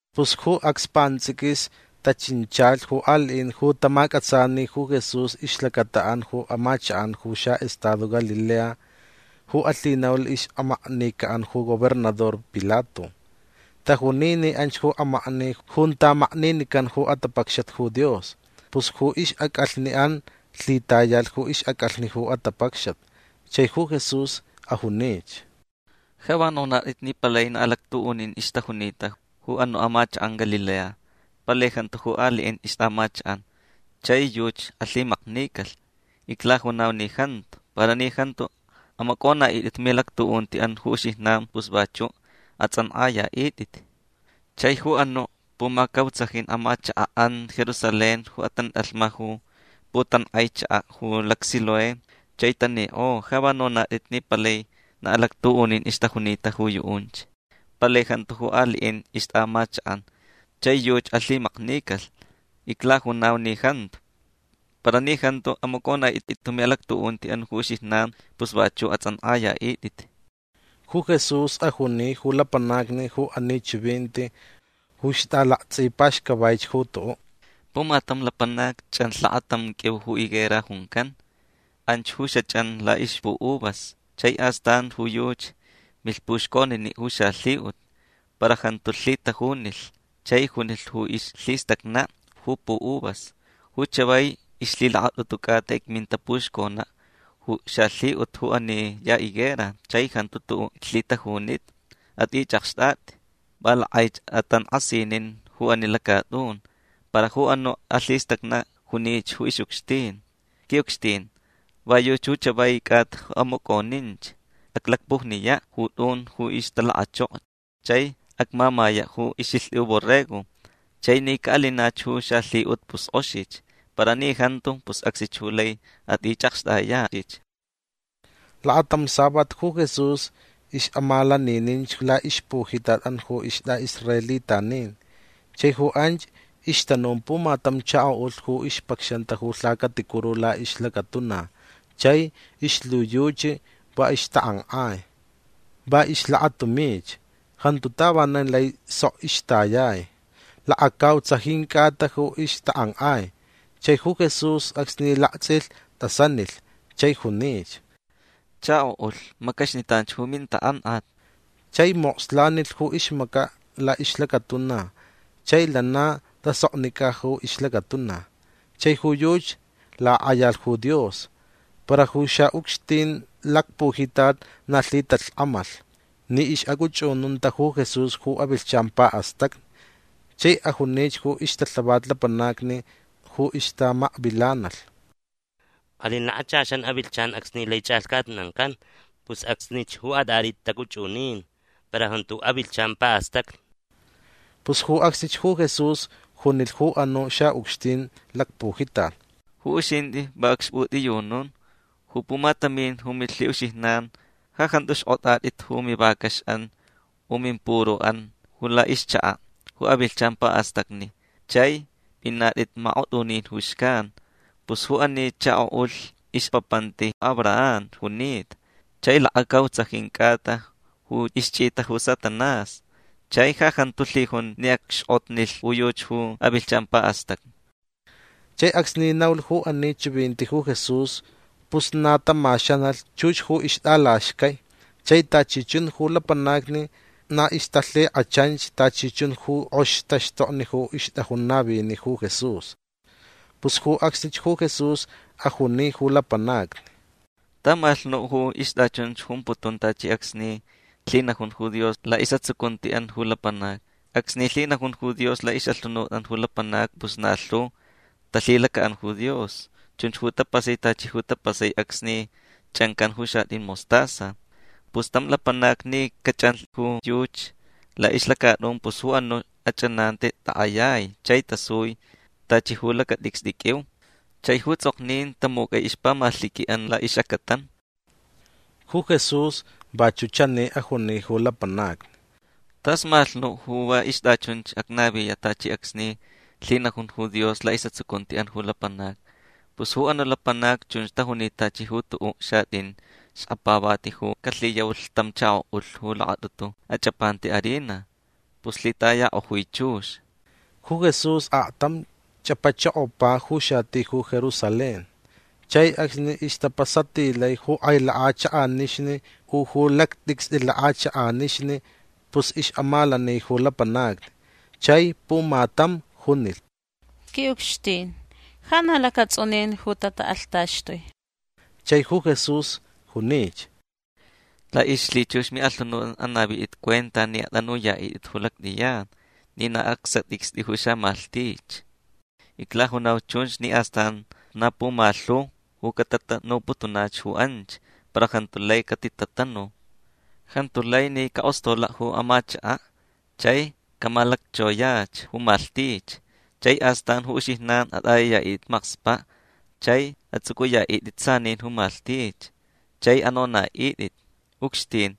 Pus ju acs pants'iquis tachinchalh ju ali'in ju tamac'atsani ju Jesús ixlacata'an ju amachak'an ju xa'estado Galilea ju alhinaulh ix'amaknica'an ju gobernador Pilato. Tajuni ni anch ju amakni junta makninican ju atapacxat ju Dios. Pus ju ix'ac'alhni'an lhitayalh ju ix'ac'alhni ju atapacxat. Chai ju Jesús ajunich: ―Ja va nonat'it ni palai na alactu'unin ixtajunita ju anu' amachak'an Galilea. Palai jantu ju ali'in ixt'a'amachak'an. Chai yuchi alhimaknicalh. Iclajunau ni jantu. Para ni jantu amac'ona'it'it ju mi'alactu'unti'an ju uxijnan pus vachu' ats'ank'aya'it'it. Chai ju anu' pumacautsajin amachaka'an Jerusalén ju atant'alhma ju putank'ai chaka' ju lacSiloé chai tanik'o ja va nonat'it ni palai na alactu'unin ixtajunita ju yu'unch. Palai jantu ju ali'in ixt'a'amachak'an. Chai yuchi alhimaknicalh. Iclajunau ni jantu. Para ni jantu amac'ona'it'it ju mi'alactu'unti'an ju uxijnan pus vachu' ats'ank'aya'it'it. Ju Jesús ajuni ju lapanacni ju ani chivinti ju ixt'alakts'ipaxcavaich ju tu'u': ―Pumatam lapanac ch'anlh lakatam q'uiu ju higuera juncan. Anch ju xach'an la'ixpu'uvas. Chai astan ju yuchi milh puxconini' ju xalhi'ut. Para jantu lhitajunilh. Chai junilh ju ixlhistacna' ju pu'uvas: “Ju chavai ixlhilakat'utu c'ata icminta puxcona' ju xalhi'ut ju ani ya higuera chai jantu tu'u' iclhitajunita. At'ich'akxt'at'i. Va lak'aich atank'asinin ju ani lacat'un”. Para ju anu' alhistacna' junich ju ix'ucxtin: “Qui'ucxtin va yuchi ju chavai c'ata ju amac'oninch. Aclacpujniya' ju t'un ju ixtalakachoko chai acmamaya' ju ix'ilht'i borrego. Chai ni ca'alinach ju xalhi'ut pus k'oxich. Para ni jantu pus acsnich ju laich at'ich'akxt'aya'ich”. Lakatam savat ju Jesús ix'amalanininch la'ixpujitat'an ju ist'a'israelitanin. Chai ju anch ixtanun pumatam chako'ulh ju ixpacxanta ju lhacaticuru la'ixlacatuna chai ixlhiyuchi va ixtak'ank'ai. Va ixlakatumich. Jantu tavanan lai sok ixtayai. Lakacautsajin c'ata ju ixtak'ank'ai. Chai ju Jesús acsni lakts'ilh t'asanilh chai junich: ―Chako'ulh macaxnitan ju mintak'ank'at. Chai mokslanilh ju ixmaca' la'ixlacatuna chai lana tasoknic'a ju ixlacatuna. Chai ju yuchi lak'ayalh ju Dios. Para ju xa'ucxtin lacpujitat na lhitalhk'amalh ni ix'ac'uch'ununta ju Jesús ju avilhchan pa'astacni. Chai ajunich ju ixtalhavat lapanacni ju ixtamakvilanalh: ―Alin lakachaxan avilhchan acsni lai ch'alhcatnancan. Pus acsnich ju at'at'it t'ac'uch'unin. Para jantu ju avilhchan pa'astacni. Pus ju acsnich ju Jesús junilh ju anu' xa'ucxtin lacpujitat: ―Ju uxint'i va acxp'ut'iyunun. Ju pumatamin ju milhi'uxijnan ja jantu xk'ot'at'it ju mivacax'an u mimpuru'an ju la'ixchaka' ju avilhchan pa'astacni chai p'inat'it mak'ot'unin ju xcan. Pus ju ani chako'ulh ixpapanti Abraham junita. Chai lakacautsajin c'ata ju ixch'ita ju Satanás. Chai ja jantu lhijun ni acxk'otnilh ju yuchi ju avilhchan pa'astacni. Chai acsni naulh ju ani chivinti ju Jesús pus na tamaxanalh chux ju ixt'alaxcai. Chai tachi chun ju lapanacni na ixtalhik'achanch tachi chun ju k'oxi taxtokni ju ixt'ajun navini' ju Jesús. Pus ju acsnich ju Jesús ajuni ju lapanacni: ―Tamalhch nu' ju ixt'achunch jumputun tachi acsni lhinajun ju Dios la'is'atsucunti'an ju lapanacni. Acsni lhinajun ju Dios la'ix'alhunut'an ju lapanacni pus na lhu talhilaca'an ju Dios. Chunch ju tapasai tachi ju tapasai acsni ch'ancan ju xat'in mostaza. Pus tam lapanac ni cach'anlh ju yuchi la'ixlacat'un pus ju anu' ach'ananti tak'ayai chai tasui tachi ju lacat'icst'i q'uiu. Chai ju ts'ok'o tamuc'ai ixpamalhiqui'an la'ix'acatan. Ju Jesús vachu' chani ajuni ju lapanacni: ―Tas malhch nu' ju va ixt'achunch acnaviya' tachi acsni lhinajun ju Dios la'is'atsucunti'an ju lapanacni. Pus ju anu' lapanacni chunch tajunita tachi ju tu'u' xat'in xkapavati ju calhiyaulh tam chako'ulh ju lakat'utu ach'apanta harina. Pus lhitayak'ojui chux. Ju Jesús aktam ch'apachokopa ju xati ju Jerusalén. Chai acsni ixtapasatilai ju k'ai lak'achak'anixni u ju lact'icst'i lak'achak'anixni pus ix'amalani ju lapanacni. Chai pumatam junilh: ―Qui'ucxtin ja na lacats'unin ju tatak'alhtaxtui. Chai ju Jesús junich: ―La'ixlhichux mi'alhunut'an anavit'it cuenta ni at'anuya'it'it ju lact'iyan ni na acsat'icst'i ju xamalhtich. Iclajunauch chunch ni astan na pumalhu ju catatanuputunach ju anch para jantu lai catitanu. Jantu lai ni cak'ostola' ju amachaka' chai camalacchoyach ju malhtich. Chai astan ju uxijnan at'ayaya'it'it makspa' chai ats'uc'uya'it'it sanin ju malhtich chai anona'it'it: “Ucxtin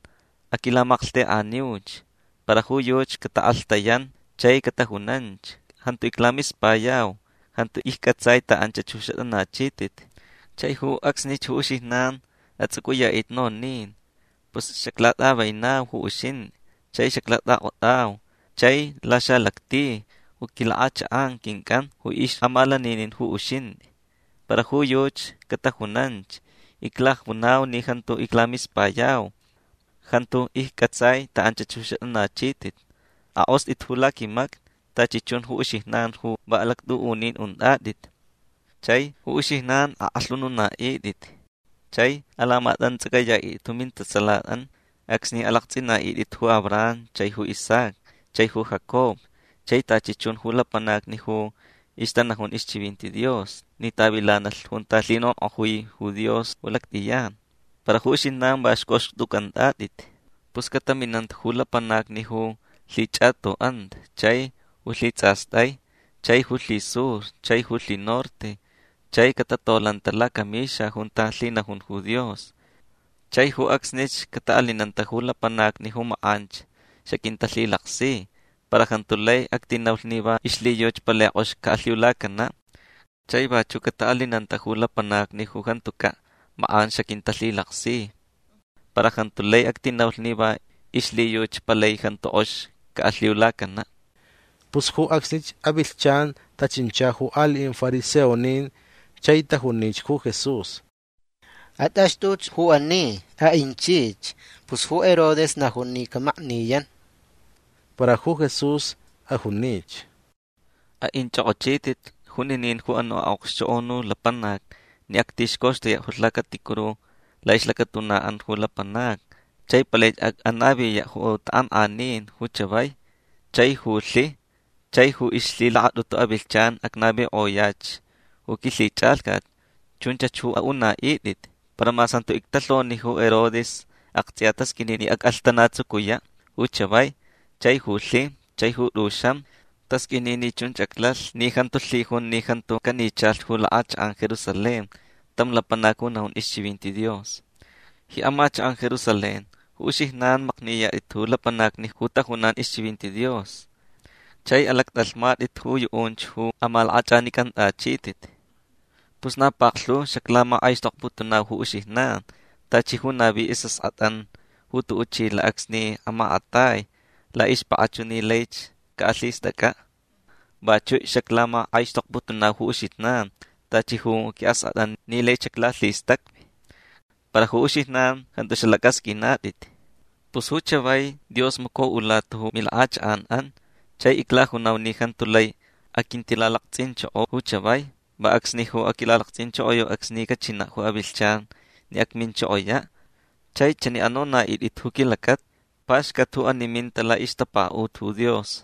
aquilamalhtek'aniuch”. Para ju yuchi catak'alhtayan chai catajunanch: “Jantu iclamispayau. Jantu icc'atsai ta anchach ju xat'anachit'it”. Chai ju acsnich ju uxijnan ats'uc'uya'it'it nonin: “Pus xaclat'avenau ju uxint'i chai xaclat'ak'ot'au. Chai laxalacti ju quilak'achak'an quinc'an ju ix'amalaninin ju uxint'i”. Para ju yuchi catajunanch: “Iclajunau ni jantu iclamispayau. Jantu icc'atsai ta anchach ju xat'anachit'it. Ak'ost'it ju laquimacni tachi chun ju uxijnan ju va alactu'unin unt'at'it”. Chai ju uxijnan ak'alhununa'it'it chai alamats'ac'aya'it'it ju mintatsalat'an acsni alakts'ina'it'it ju Abraham chai ju Isaac chai ju Jacob chai tachi chun ju lapanacni ju ixtanajun ixchivinti Dios ni tavilanalh junta lhinonk'ojui ju Dios ju lact'iyan. Para ju uxijnan va xc'oxt'uc'ant'at'it. Pus cataminanta ju lapanacni ju lhich'ato'anta chai ju lhits'ast'ai chai ju lhisur chai ju lhinorte chai catatolanta lacamixa junta lhinajun ju Dios. Chai ju acsnich cata'alinanta ju lapanacni ju mak'anch xaquintalhilaksi. Para jantu lai actinaulh ni va ixlhiyuchi palai k'ox ca'alhiulacana'. Chai vachu' cata'alinanta ju lapanacni ju jantuca' mak'an xaquintalhilaksi. Para jantu lai actinaulh ni va ixlhiyuchi palai jantu k'ox ca'alhiulacana'. Pus ju acsnich avilhchan tachincha ju ali'in fariseonin chai tajunich ju Jesús: ―At'axt'uch ju ani. A'inchich. Pus ju Herodes najun ni camakniyan. Para ju Jesús ajunich: ―A'inch'ok'ochit'it juninin ju anu' a'okxchok'onu lapanac ni actixcoxtuya' ju lhacaticuru la'ixlacatuna'an ju lapanacni chai palaich ac'anaviya' ju tak'ank'anin ju chavai chai ju lhi. Chai ju ixlhilakat'utu avilhchan acnavik'oyach ju quilhich'alhcat. Chunchach ju a'una'it'it. Para mas jantu ictalhoni ju Herodes akts'iya tasq'uini ni ac'alhtanatsucuya' ju chavai chai ju lhi chai ju t'uxam. Tasq'uini ni chunch aclalh ni jantu lhijun ni jantu canichalh ju lak'achak'an Jerusalén tam lapanac ju najun ixchivinti Dios. Ji amachak'an Jerusalén ju uxijnan makniyat'it ju lapanacni ju tajunan ixchivinti Dios. Chai alac'at'alhmat'it ju yu'unch ju amalak'ach'anic'ant'achit'it. Pus na paklhu xaclamak'aixtokputunau ju uxijnan tachi ju navi is'ask'at'an ju tu'u' chila' acsni amakatai la'ixpak'achu ni laich ca'alhist'ac'a'. Vachu' xaclamak'aixtokputunau ju uxijnan tachi ju qui'ask'at'an ni laich xaclalhistacvi. Para ju uxijnan jantu xalac'asq'uinat'it. Pus ju chavai Dios maco'ulata ju milak'achak'an'an. Chai iclajunau ni jantu lai aquintilalakts'inchoko ju chavai. Va acsni ju aquilalakts'inchokoyau acsni cachina' ju avilhchan ni acminchokoya' chai chani anona'it'it ju quilacata: “Paxcat ju ani ju minta la'ixtapaka'ut ju Dios”.